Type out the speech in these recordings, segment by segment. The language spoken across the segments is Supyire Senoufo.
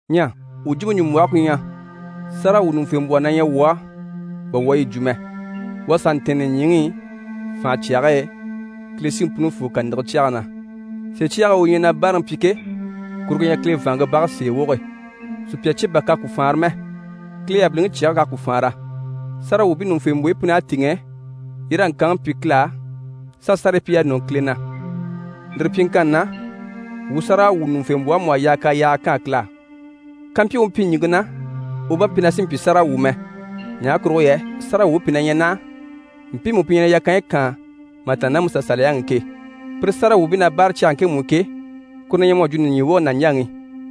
Ɲyɛ wuu jwumpe ɲùmbwɔhe ku ɲyɛ: sáragawwuɲuŋufembwɔhɔ na ɲyɛ wuu á bà wuu à yi jwo mɛ. U à sà ntɛ̀ɛn nìɲyiŋi i fànhe cyage e, Kile Siŋi Punifoo kàniŋɛ cyɛge na. Sèe cyage e u ɲyɛ na báaraŋi pyi ke, kuru ku ɲyɛ Kile vàanŋke bage sèe woge, sùpya cye kurugo bà k'à faanra mɛ, Kile yabiliŋi cyɛge k'à ku faanra. Sáragawwuubii ɲùŋufembwoyi pun'à tìŋɛ, yi raa ŋkanŋi pyi Kile á s'a sárayi pyi y'a nɔni Kile na. Lire pyiŋkanni na, wuu sáragawwuɲuŋufembwɔhe mú à yaa k'a yaaga kaan Kile á. Kàmpyi u mpyi ɲìŋke na, u bá mpyi na sì n‑pyi sáragawwu mɛ, ɲaha kurugo yɛ sáragawwuubii pìi na ɲyɛ naha mpiimu pi ɲyɛ na yakanyi kaan mà tàanna ná MusaSaliyaŋi i ke. Pire sáragawwuubii na báare cyage ŋkemu i ke, kuru na ɲyɛ mu à jwo nìɲyiŋi woge nàɲjaŋi.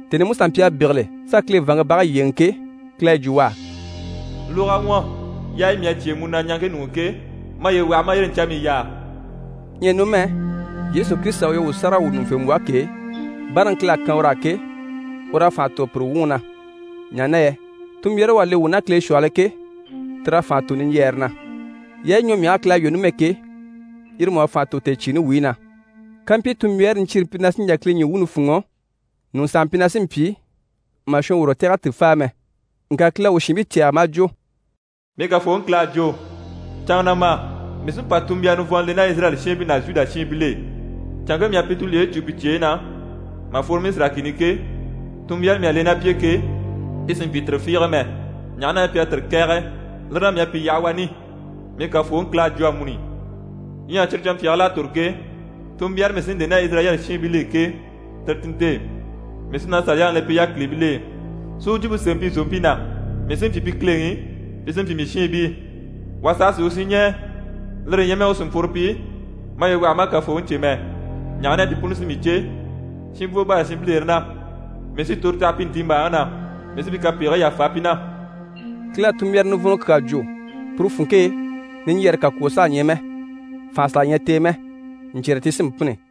Tèni i Musa mpyi a bégele s'a Kile vàanŋke bage yyéeŋi ke, Kile à yi jwo u á: «Lóg'a ɲwɔ, yaayi mii à cyêe mu na ɲaŋke ɲuŋ'i ke, maye waha ma a yire ɲcamii yaa.» Ɲyɛ numɛ, Yesu Kirisita u ɲyɛ wuu sáragawwuɲuŋufembwɔhe ke, báaraŋi Kile à kan ur'á ke, ur'à fànha tò pire wuŋi na, ɲaha na yɛ tunmbyaare u à le wuu ná Kile shwɔhɔl'e ke, tir'à fànha tò niɲjyɛɛre na. Yaayi ɲwɔmyahigii Kile à lwɔ́ numɛ ke, yire mú à fànha tò tèecyiini wuyi na. Kàmpyi tunmbyaare niɲcyiire mpyi na sí n‑jà Kile ɲyii wuuni fûnŋɔ, ɲùŋɔ sàha mpyi na sí n‑pyi, mà shɔnworo tɛ̀g'a ti fáa mɛ. Ŋka Kile à u shiinbii cɛ̂ɛgɛ maa jwo: «Mii Kafooŋi Kile à jwo, “Canŋa na ma, mii sí n‑pa tunmbyara nivɔnnɔ le ná Izirayɛli shiinbii ná Zhuda shiinbil'e. Canŋke mii à pi tulyeyi cû pi cyeyi na, mà fworo Misira kìni i ke, tunmbyaare mii à le ná pi e ke, ti sì n‑pyi tire fiige mɛ, ɲaha na yɛ pi à tire kɛ̀ɛge. Lire na, mii à pi yaha wani.” Mii Kafooŋi Kile à jwo amuni. “Ɲyɛ cyire canmpyaagil'à tòro ke, tunmbyaare mii sí n‑le ná Izirayɛli shiinbil'e ke, tire ti nte: Mii sí na Saliyaŋi le pi yákilibil'e, si u jwumpe sémɛ pi zòompii na. Mii sí n‑pyi pi Kileŋi, pi sí n‑pyi mii shiinbii. Wà saha sì u shinɲɛɛ, lire ɲyɛ mɛ u cìnmpworo pyi ‘Maye waha ma a Kafooŋi cè’ mɛ, ɲaha na yɛ pi puni sí mii cè, shinbwo bâra shinbilere na. Mii sí toro taha pi ntiimbaaŋi na, mii sí pi kapegigii yàfa pi na.”» Kile à tunmbyara nivɔnnɔ kyaa jwo, puru funŋke e, niɲjyɛɛre kakwoo saha ɲyɛ mɛ, fànha saha ɲyɛ t'e mɛ, ɲcyɛ̀rɛ ti sí n‑pînni.